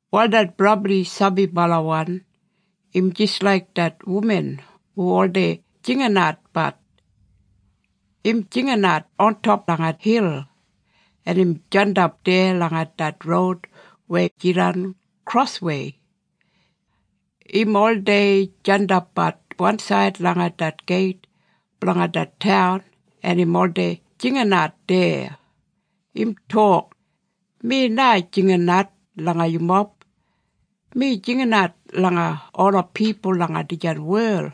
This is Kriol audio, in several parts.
Wal det brabli sabibalawan im jis laik det wuman hu oldei jinginatbat. Im jinginat ontop langa hil, en im jandap deya langa det roud weya jidan kroswei. Im oldei jandapbat wansaid langa det geit blanga det taun en im oldei jinginat deya. Im tok, “Mi na jinginat langa yumob. Mi jinginat langa ola pipul langa dijan wel.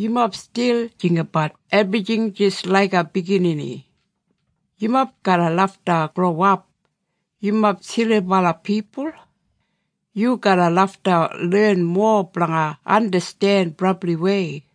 Yumob stil jinggabat ebrijing jis laiga biginini. Yumob garra lafta growap. Yumob silibala pipul. Yu garra lafta len mowa blanga andasten brabliwei.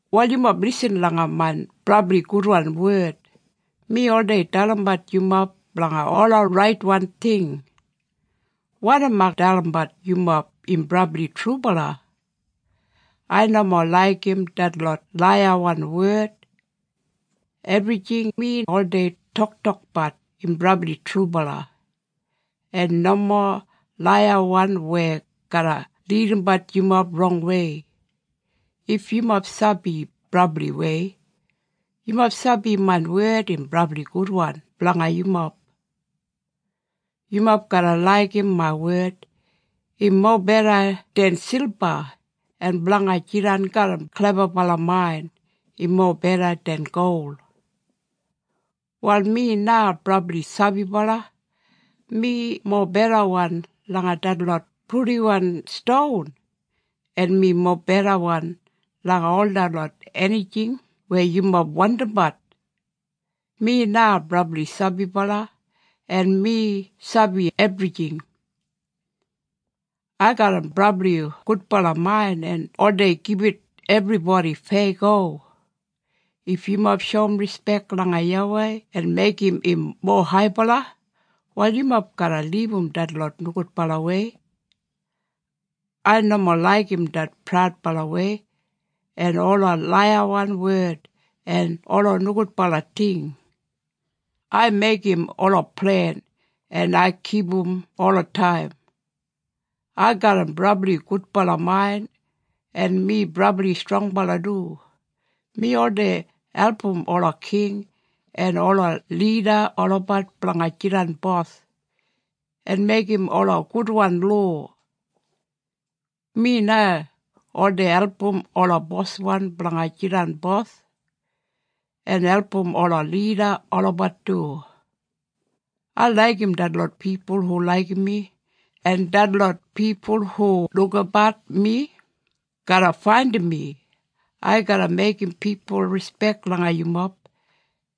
“Wal yumob lisin langa main brabli gudwan wed. Mi oldei dalimbat yumob blanga ola raitwan ting. Wanim ai dalimbat yumob im brabli trubala. Ai nomo laigim detlot laiyawan wed. Ebrijing mi oldei toktokbat im brabli trubala, en nomo laiyawan weya garra lidimbat yumob rongwei. If yumob sabi brabliwei, yumob sabi main wed im brabli gudwan blanga yumob. Yumob garra laigim main wed. Im mobeda den silba. En blanga jidan garram klebabala main, im mobeda den gol. “Wal mi na brabli sabibala. Mi mobedawan langa detlot purdiwan ston, en mi mobedawan langa ol detlot enijing weya yumob wandimbat. Mi na brabli sabibala, en mi sabi ebrijing. Ai garram brabli gudbala main en oldei gibit ebribodi feyago. If yumob shoum rispek langa YAWEI en meigim im mowa haibala, wal yumob garra libum detlot nogudbalawei. Ai nomo laigim det praudbalawei, en ola laiyawan wed en ola nogudbala ting. Ai meigim ola plen en ai kipum olataim. Ai garram brabli gudbala main en mi brabli strongbala du. Mi oldei album ola king en ola lida olabat blanga jidan bos, en meigim ola gudwan lowa. Mi na oldei album ola boswan blanga jidan bos, en album ola lida olabat du. Ai laigim detlot pipul hu laigim mi, en detlot pipul hu lukabat mi, garra faindim mi. Ai garra meigim pipul rispek langa yumob,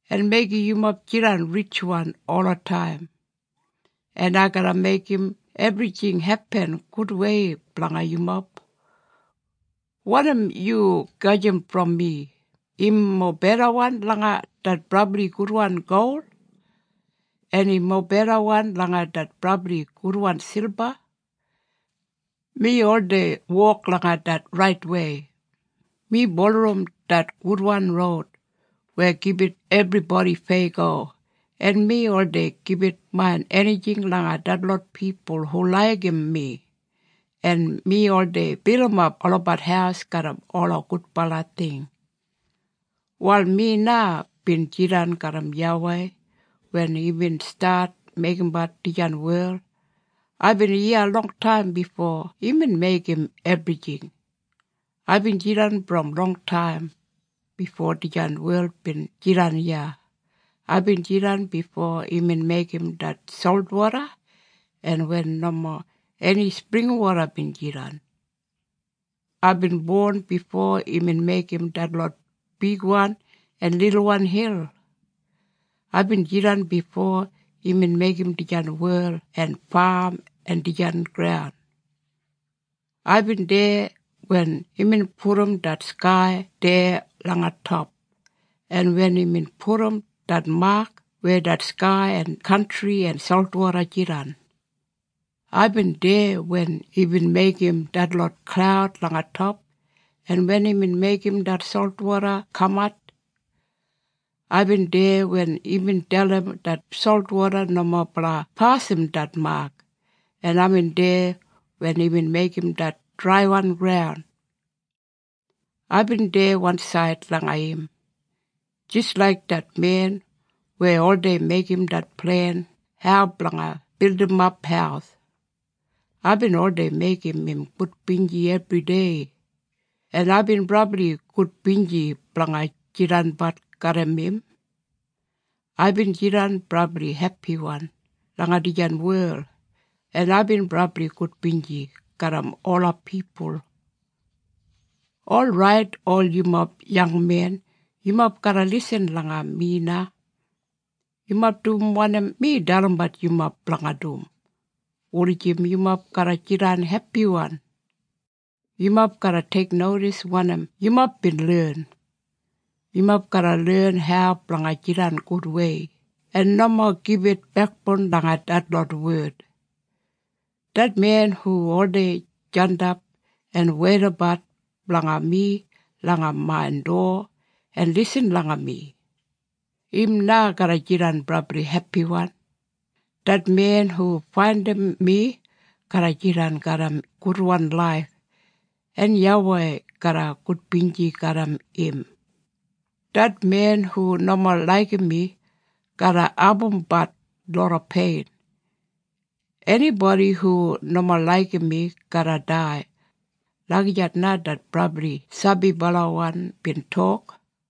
en meigim yumob jidan ritjwan olataim. En ai garra meigim ebrijing hepin gudwei blanga yumob. Wanim yu gajim brom mi, im mobedawan langa det brabli gudwan gol, en im mobedawan langa det brabli gudwan silba. Mi oldei wok langa det raitwei. Mi bulurrum det gudwan roud weya gibit ebribodi feyago, en mi oldei gibit main enijing langa detlot pipul hu laigim mi, en mi oldei bilimap olabat haus garram ola gudbala ting. “Wal mi na bin jidan garram YAWEI wen imbin stat meigimbat dijan wel. Aibin iya longtaim bifo imbin meigim ebrijing. Aibin jidan brom longtaim, bifo dijan wel bin jidan iya. Aibin jidan bifo imbin meigim det solwoda, en wen nomo eni springwoda bin jidan. Aibin bon bifo imbin meigim detlot bigwan en lilwan hil. Aibin jidan bifo imbin meigim dijan wel en fam en dijan graun. Aibin deya wen imbin pudum det skai deya langa top, en wen imbin pudum det mak weya det skai en kantri en solwoda jidan. Aibin deya wen imbin meigim detlot klaud langa top, en wen imbin meigim det solwoda kamat. Aibin deya wen imbin dalim det solwoda nomo blanga pasim det mak, en aibin deya wen imbin meigim det draiwan graun. Aibin deya wansaid langa im, jis laik det men weya oldei meigim det plen hau blanga bildimap haus. Aibin oldei meigim im gudbinji ebridei, en aibin brabli gudbinji blanga jidanbat garram im. Aibin jidan brabli hepiwan langa dijan wel, en aibin brabli gudbinji garram ola pipul. “Orait ol yumob yangmen, yumob garra lisin langa mi na. Yumob dum wanim mi dalimbat yumob blanga dum, wulijim yumob garra jidan hepiwan. Yumob garra teiknodis wanim yumob bin len. Yumob garra len hau blanga jidan gudwei, en nomo gibit bekboun langa detlot wed. Det men hu oldei jandap en weidabat blanga mi langa main dowa en lisin langa mi, im na garra jidan brabli hepiwan. Det men hu faindim mi, garra jidan garram gudwan laif, en YAWEI garra gudbinji garram im. Det men hu nomo laigim mi garra abumbat loda pein. Enibodi hu nomo laigim mi garra dai.” Lagijat na det brabli sabibalawan bin tok.